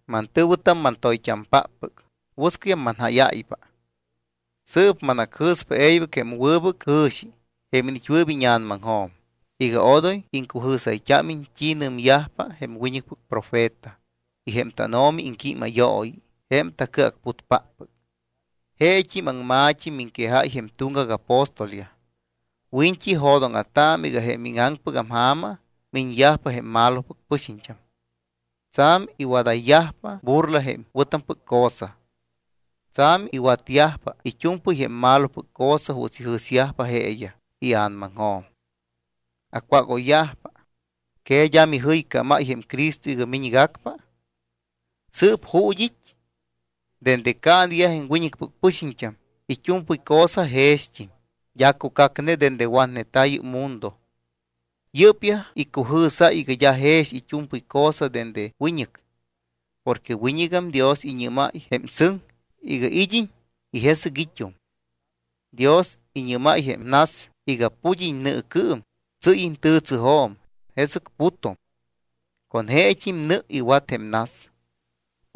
Mantɨ̱wɨtam, mantoyt́ampáppɨc, wɨscɨyam manjáyáypa. Sɨɨp manacjɨ̱spa e̱ybɨc jém wɨbɨc jɨ̱xi jém iniit́wɨɨp íña̱namaŋjo̱m iga odoy iŋcujɨ̱sayt́ámiñ t́i nɨmyajpa jém wiñɨcpɨc profeta y jém tánO̱mi iŋquímayooyi jém tacɨacputpáppɨc. Jeet́im aŋma̱t́i miŋquejáy jém tuŋgac apóstolyaj. Wiñt́i, jo̱dóŋa̱taamɨ iga jém íŋaŋpɨgam ja̱ma miñyajpa jém malopɨc pɨxiñt́am, tsa̱m iwadayyajpa burla jém wɨ̱tampɨc cosa. Tsa̱m iwatyajpa it́u̱mpɨy jém malopɨc cosa juuts ijɨ̱syajpa jeeyaj ia̱namaŋjo̱m. Acwágoyyajpa: “¿Que d́a mijɨycámáy jém Cristo iga miñgacpa? ¿Sɨɨp ju̱t́ it́? Dende caaneyaj jém wiñɨcpɨc pɨxiñt́am, it́u̱mpɨy cosa jext́im, d́a cucacne dende watneta̱ yɨ́p mundo.” Yɨ́pyaj icujɨ̱sáy iga d́a jex it́u̱mpɨy cosa dende wiñɨc. Porque wiñɨgam Dios iñɨ́máy jém sɨŋ iga id́iñ y jesɨc it́um. Dios iñɨ́máy jém nas iga pud́iñ nɨɨcɨɨm, tsɨ́yiñ tɨtsɨjo̱m, jesɨc putum. Con jeet́im nɨ iwat jém nas.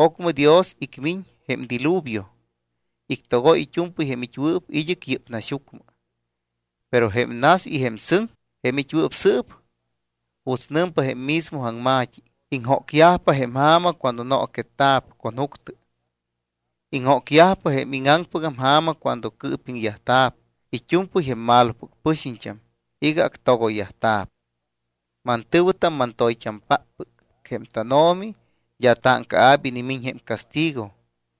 Ocmɨ Dios icmiñ jém diluvio, ictogoy it́u̱mpɨy jém it́wɨɨp id́ɨc yɨ́p naxyucmɨ. Pero jém nas y jém sɨŋ jém it́wɨɨp sɨɨp, juuts nɨmpa jém mismo aŋma̱t́i, iŋjócyajpa jém ja̱ma cuando nooquetta̱p con juctɨ. Iŋjócyajpa jém íŋaŋpɨgam ja̱ma cuando cɨɨpiŋyajta̱p it́u̱mpɨy jém malopɨc pɨxiñt́am iga actogoyyajta̱p. Mantɨ̱wɨtam, mantoyt́ampáppɨc, jém tánO̱mi d́a táŋcaa̱p inimiñ jém castigo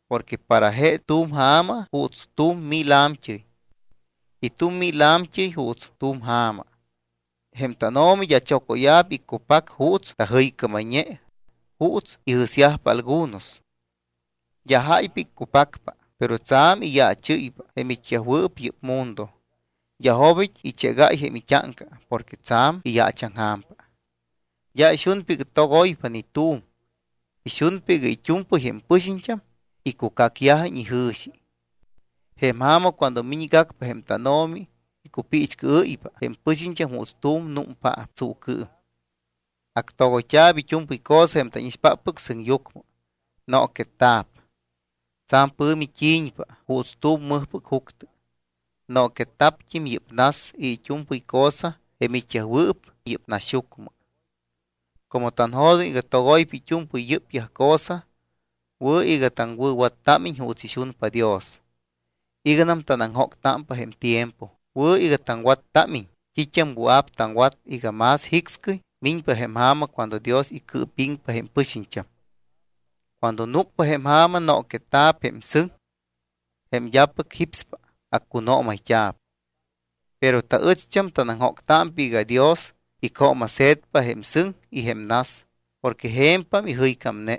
porque para je tu̱m ja̱ma juuts tu̱m mil a̱mt́ɨy. Y tu̱m mil a̱mt́ɨy juuts tu̱m ja̱ma. Jém tánO̱mi d́a chocóya̱p iccupac juuts tajɨycámayñe juuts ijɨ̱syajpa algunos. D́a jáypa iccupacpa, pero tsa̱m iyaachɨ́ypa jém it́yajwɨɨp yɨ́p mundo, d́a jobit́ ichégáy jém it́áŋca porque tsa̱m iyaachaŋja̱mpa. D́a ixunpa iga togoypa ni tu̱m. Ixunpa iga it́u̱mpɨy jém pɨxiñt́am icucacyajiñ ijɨ̱xi. Jém ja̱ma, cuando miñgacpa jém tánO̱mi, icupiichcɨɨ́ypa jém pɨxiñt́am juuts tu̱m númpaap tsuucɨɨm. Actogoyt́a̱p it́u̱mpɨy cosa jém tánixpáppɨc sɨŋyucmɨ. Nooquetta̱p. Tsa̱m pɨ̱mi t́i̱ñpa juuts tu̱m mɨjpɨc juctɨ. Nooquetta̱pt́im yɨ́p nas y it́u̱mpɨy cosa jém it́yajwɨɨp yɨ́p naxyucmɨ. Como tanjo̱doŋ iga togoypa it́u̱mpɨy yɨ́pyaj cosa, wɨ̱ iga taŋwɨ̱wattámiñ juuts ixunpa Dios. Iganam tanaŋjóctámpa jém tiempo, wɨ̱ iga taŋwattámiñ t́it́am wɨa̱p taŋwat iga más jicscɨy miñpa jém ja̱ma cuando Dios icɨɨpiŋpa jém pɨxiñt́am. Cuando núcpa jém ja̱ma nooquetta̱p jém sɨŋ. Jém d́apɨc jípspa, accunoomayt́a̱p. Pero taɨcht́am tanaŋjóctámpa iga Dios icjooma̱se̱tpa jém sɨŋ y jém nas porque je̱mpam ijɨycámne.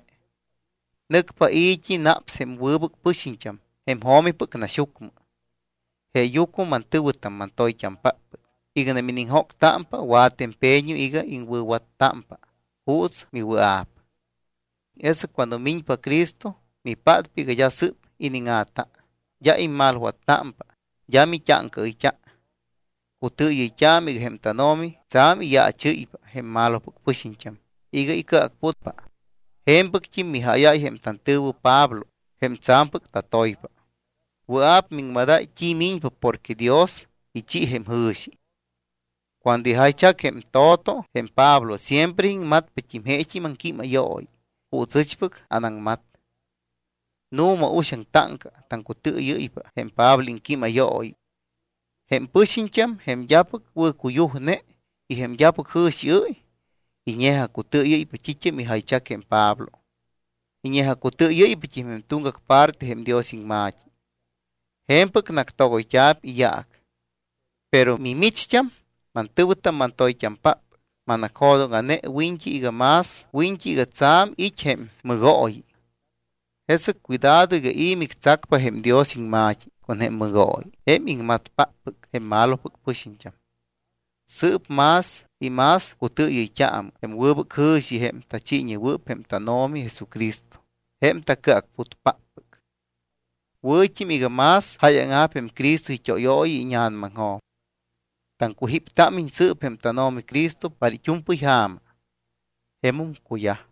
Nɨcpa i̱t́i naps jém wɨbɨc pɨxiñt́am jém jo̱mipɨc naxyucmɨ. Jeeyucmɨ mantɨ̱wɨtam, mantoyt́ampáppɨc, iganam iniŋjóctámpa, wa̱tɨ empeño iga iŋwɨ̱wattámpa juuts miwɨa̱p. Jesɨc cuando miñpa Cristo, mipátpa iga d́a sɨ́p iníŋa̱ta, d́a immalwattámpa, d́a mit́áŋcaɨyt́a. Cutɨɨyɨyt́aamɨ iga jém tánO̱mi tsa̱m iyaachɨ́ypa jém malopɨc pɨxiñt́am iga icɨacputpa. Je̱mpɨct́im mijáyáy jém tantɨ̱wɨ Pablo jém tsa̱mpɨc tantoypa. Wɨa̱p miŋmadáy t́i miñpa porque Dios ichi jém jɨ̱xi. Cuando ijaychac jém to̱to jém Pablo, siempre iŋmatpat́im jeet́im aŋquímayooyi juuts ɨchpɨc anaŋmat. Nu̱ma, uxaŋ táŋca taŋcutɨɨyɨ́ypa jém Pablo iŋquímayooyi. Jém pɨxiñt́am, jém d́apɨc wɨ̱cuyujne y jém d́apɨc jɨ̱xiɨ́y, iñe̱jacutɨɨyɨ́ypa t́it́am ijaychac jém Pablo. Iñe̱jacutɨɨyɨ́yt́im jém tuŋgac parte jém Dios iŋma̱t́i. Je̱mpɨc nactogoyyajta̱p iyaac. Pero mimicht́am, mantɨ̱wɨtam, mantoyt́ampáppɨc, manacjo̱dóŋa̱ne wiñt́i iga tsa̱m it́ jém mɨgooyi. Jesɨc cuidado iga i̱ mictsacpa jém Dios iŋma̱t́i con jém mɨgooyi jém iŋmatpáppɨc jém malopɨc pɨxiñt́am. Sɨɨp más y más cutɨɨyɨyt́aamɨ jém wɨbɨc jɨ̱xi jém tachiiñewɨɨp jém tánO̱mi Jesucristo, jém taCɨacputpáppɨc. Wɨ̱t́im iga más jáyaŋa̱p jém Cristo it́óyooyi íña̱namaŋjo̱m. Taŋcujíptámiñ sɨɨp jém tánO̱mi Cristo para it́u̱mpɨy ja̱ma. Jemum cuyaj.